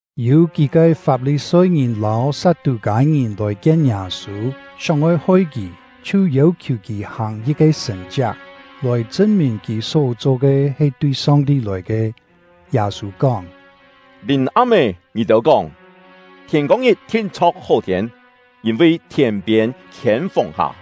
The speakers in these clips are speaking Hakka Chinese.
Yû kí-ke Fap-li-soi-ngìn lâu Sat-tû-kâi-ngìn lòi kien Yâ-sû, sióng-oi hoi kì, chhiu yêu-khiù kì hàng yit-ke sṳ̀n-chiak, lòi chṳn-mìn kì só-cho ke he tui Song-ti lòi ke. Yâ-sû kóng: “Lìm-am-é, ngì-têu kóng: ‘Thiên-kông-ngit thin-chho̍k hó-thiên, yîn-vi thiên-piên khiên fùng-hà.’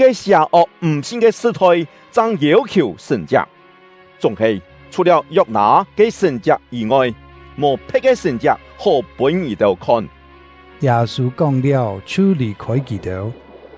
Yit-ke sià-ok m̀-sin ke sṳ-thoi chang yêu-khiù sṳ̀n-chiak; chúng-he, chhù-liáu Yok-nâ ke sṳ̀n-chiak yî-ngoi, mò phe̍t ke sṳ̀n-chiak hó pûn ngì-têu khon.” Yâ-sû kóng-liáu, chhiu lì-khôi kì-têu.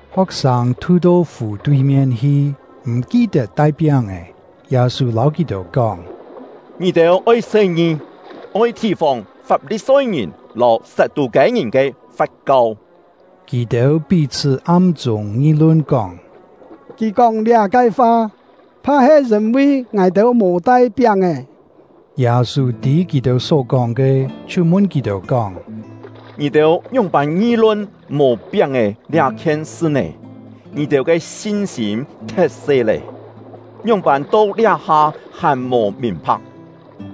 Ho̍k-sâng thu-to fù tui-mien hi, m̀ ki-tet tai piáng-è. Yâ-sû lâu kì-têu kóng: “Ngì-têu oi se-ngi, oi thì-fòng Fap-li-soi-ngìn lâu Sat-tû-kâi-ngìn ke fat-kau!” Kì-têu pí-chhṳ́ am-chûng ngi-lun kóng: “Kì kóng liá-ke fa, pha-he yîn-vi ngài-têu mò tai piáng-è.” Yâ-sû tî kì-têu só-kóng ke, chhiu mun kì-têu kóng: “Ngì-têu ngióng-pân ngi-lun mò piáng-è liá-khien sṳ nè? Ngì-têu ke sin-sîm thet-se lé! Ngióng-pân to liá-ha hàn mò mìn-pha̍k!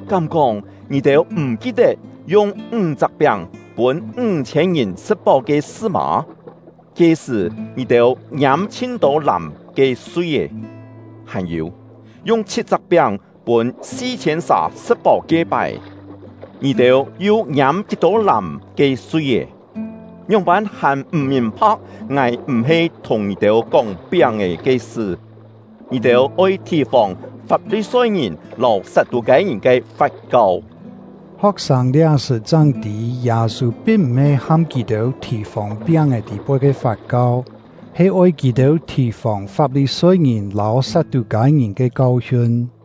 Kám-kóng ngì-têu m̀ ki-tet yung ńg-chak piáng pûn ńg-chhiên ngìn sṳ̍t-páu ke sṳ mâ? Ke-sṳ̀ ngì-têu ngiâm kí-tô làm ke sui-é? Hàn-yû, yung chhit-chak piáng pûn si-chhiên sà sṳ̍t-páu ke-pái, ngì-têu yu ngiâm kí-tô làm ke sui-é? Ngióng-pân hàn m̀ mìn-pha̍k ngài m̀-he thùng ngì-têu kóng piáng-è ke sṳ? Ngì-têu oi thì-fòng Fap-li-soi-ngìn lâu Sat-tû-kâi-ngìn ke fat-kau!” Ho̍k-sâng liá-sṳ̀ chang tî Yâ-sû pin m̀-he ham kì-têu thì-fòng piáng-è tî-poi ke fat-kau, he oi kì-têu thì-fòng Fap-li-soi-ngìn lâu Sat-tû-kâi-ngìn ke kau-hiun.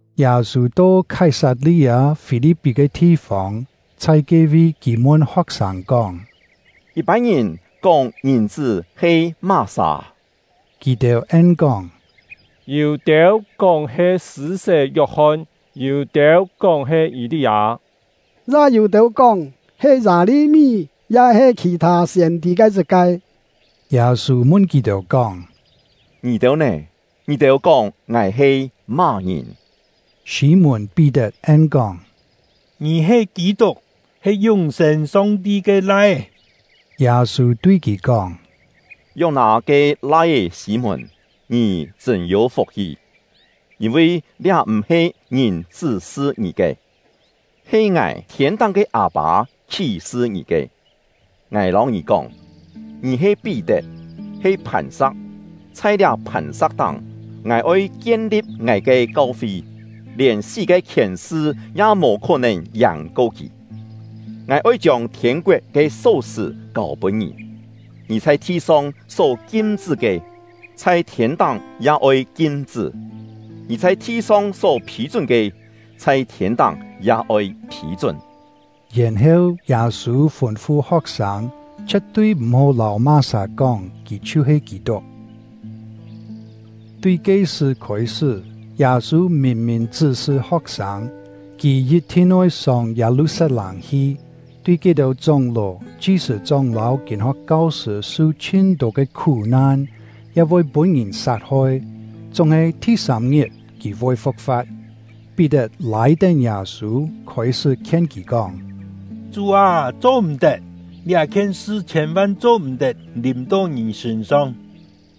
Yâ-sû to Khái-sat-li-â-Fî-li̍p-pí ke thi-fông; chhai ke-vi, kì mun ho̍k-sâng kóng: “Yit-pân ngìn kóng Ngìn-chṳ́ he má-sà?” Kì-têu en-kóng: “Yû-têu kóng he Sṳ̂-sé Yok-hon; yû-têu kóng he Yî-li-â; ya yû-têu kóng he Yâ-li-mí ya-he khì-thâ siên-tî ke yit-ke.” Yâ-sû mun kì-têu kóng: “Ngì-têu nè? Ngì-têu kóng ngài he má-ngìn?” Sî-mùn-Pí-tet en-kóng: “Ngì he Kî-tuk, he yún-sên Song-ti ke Lai-é.” Yâ-sû tui kì kóng: “Yok-nâ ke lai-é Sî-mùn, ngì chṳ̂n yû fuk-hi; yîn-vi liá m̀-he ngìn chṳ́-sṳ ngì ke, he ngài thiên-táng ke Â-pâ khí-sṳ ngì ke. Ngài lâu ngì kóng, ngì he Pí-tet, he phàn-sa̍k; chhai liá phàn-sa̍k táng, ngài oi kien-li̍p ngài ke kau-fi, lièn sí ke khièn-sṳ ya mò khó-nèn yàng-ko kì. Ngài oi chiông thiên-koet ke só-sṳ̀ kâu-pûn ngì, ngì chhai thi-song só kim-chṳ́ ke, chhai thiên-táng ya oi kim-chṳ́; ngì chhai thi-song só phî-chún ke, chhai thiên-táng ya oi phî-chún.” Yèn-heu, Yâ-sû fûn-fu ho̍k-sâng, chhie̍t-tui m̀-hó lâu má-sà kóng kì chhiu-he Kî-tuk. Tui ke-sṳ̀ khôi-sṳ́, Yâ-sû mìn-mìn chṳ́-sṳ ho̍k-sâng, kì yit-thin oi sông Yâ-lu-sat-lâng hi, tui ke-têu chóng-ló, chi-sṳ̂-chóng lâu kîn-ho̍k kau-sṳ̂ su chhin-tô ke khú-nan, ya voi pûn-ngìn sat-hoi, chúng-he thi-sâm-ngit kì voi fu̍k-fa̍t. Pí-tet lâi-tén Yâ-sû, khôi-sṳ́ khien kì kóng: “Chú â, cho-m̀-tet! Liá-khien sṳ chhiên-van cho-m̀-tet lìm-to ngì sṳ̂n-song!”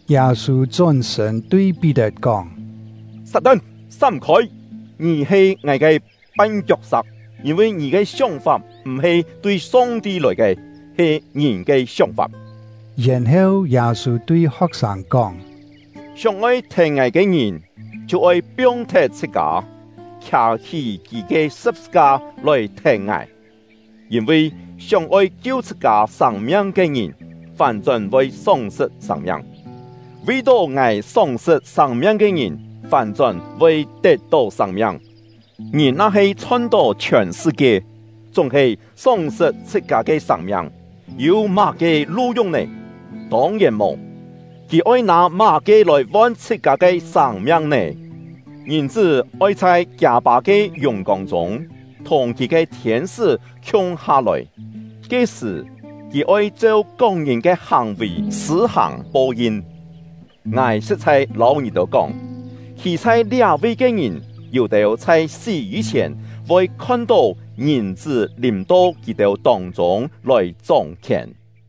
Yâ-sû chón-sṳ̂n tui Pí-tet kóng: “Sat-tan, sám-khôi! Ngì he ngài ke pan-kiok-sa̍k; yîn-vi ngì ke sióng-fap m̀-he tui Song-ti lòi ke, he ngìn ke sióng-fap.” Yèn-heu, Yâ-sû tui ho̍k-sâng kóng: “Sióng-oi thèn ngài ke ngìn, chhiu oi piong-thet chhṳ-kâ, khià-hí kì ke sṳ̍p-sṳ-ka lòi thèn ngài. Yîn-vi sióng-oi kiu chhṳ-kâ sâng-miang ke ngìn, fán-chón voi sóng-sṳt sâng-miang; vi-tó ngài sóng-sṳt sâng-miang ke ngìn, fán-chón voi tet-tó sâng-miang. Ngìn na-he chhon-tó chhiòn sṳ-kie, chúng-he sóng-sṳt chhṳ-kâ ke sâng-miang, yû má-ke lu-yung nè? Tông-yèn mò! Kì oi nâ má-ke lòi von chhṳ-kâ ke sâng-miang nè? Ngìn-chṳ́ oi chhai kiâ Pâ ke yùng-kông chûng, thùng kì ke thiên-sṳ́ khiung-ha lòi. Ke-sṳ̀, kì oi cheu kok-ngìn ke hàng-vì sṳ̂-hàng po-yin. Ngài sṳ̍t-chhai lâu ngì-têu kóng, khî chhai liá-vi ke ngìn, yû-têu chhai sí yî-chhièn voi khon-tó Ngìn-chṳ́ lìm-to kì-têu tông-chûng lòi chóng-khièn.”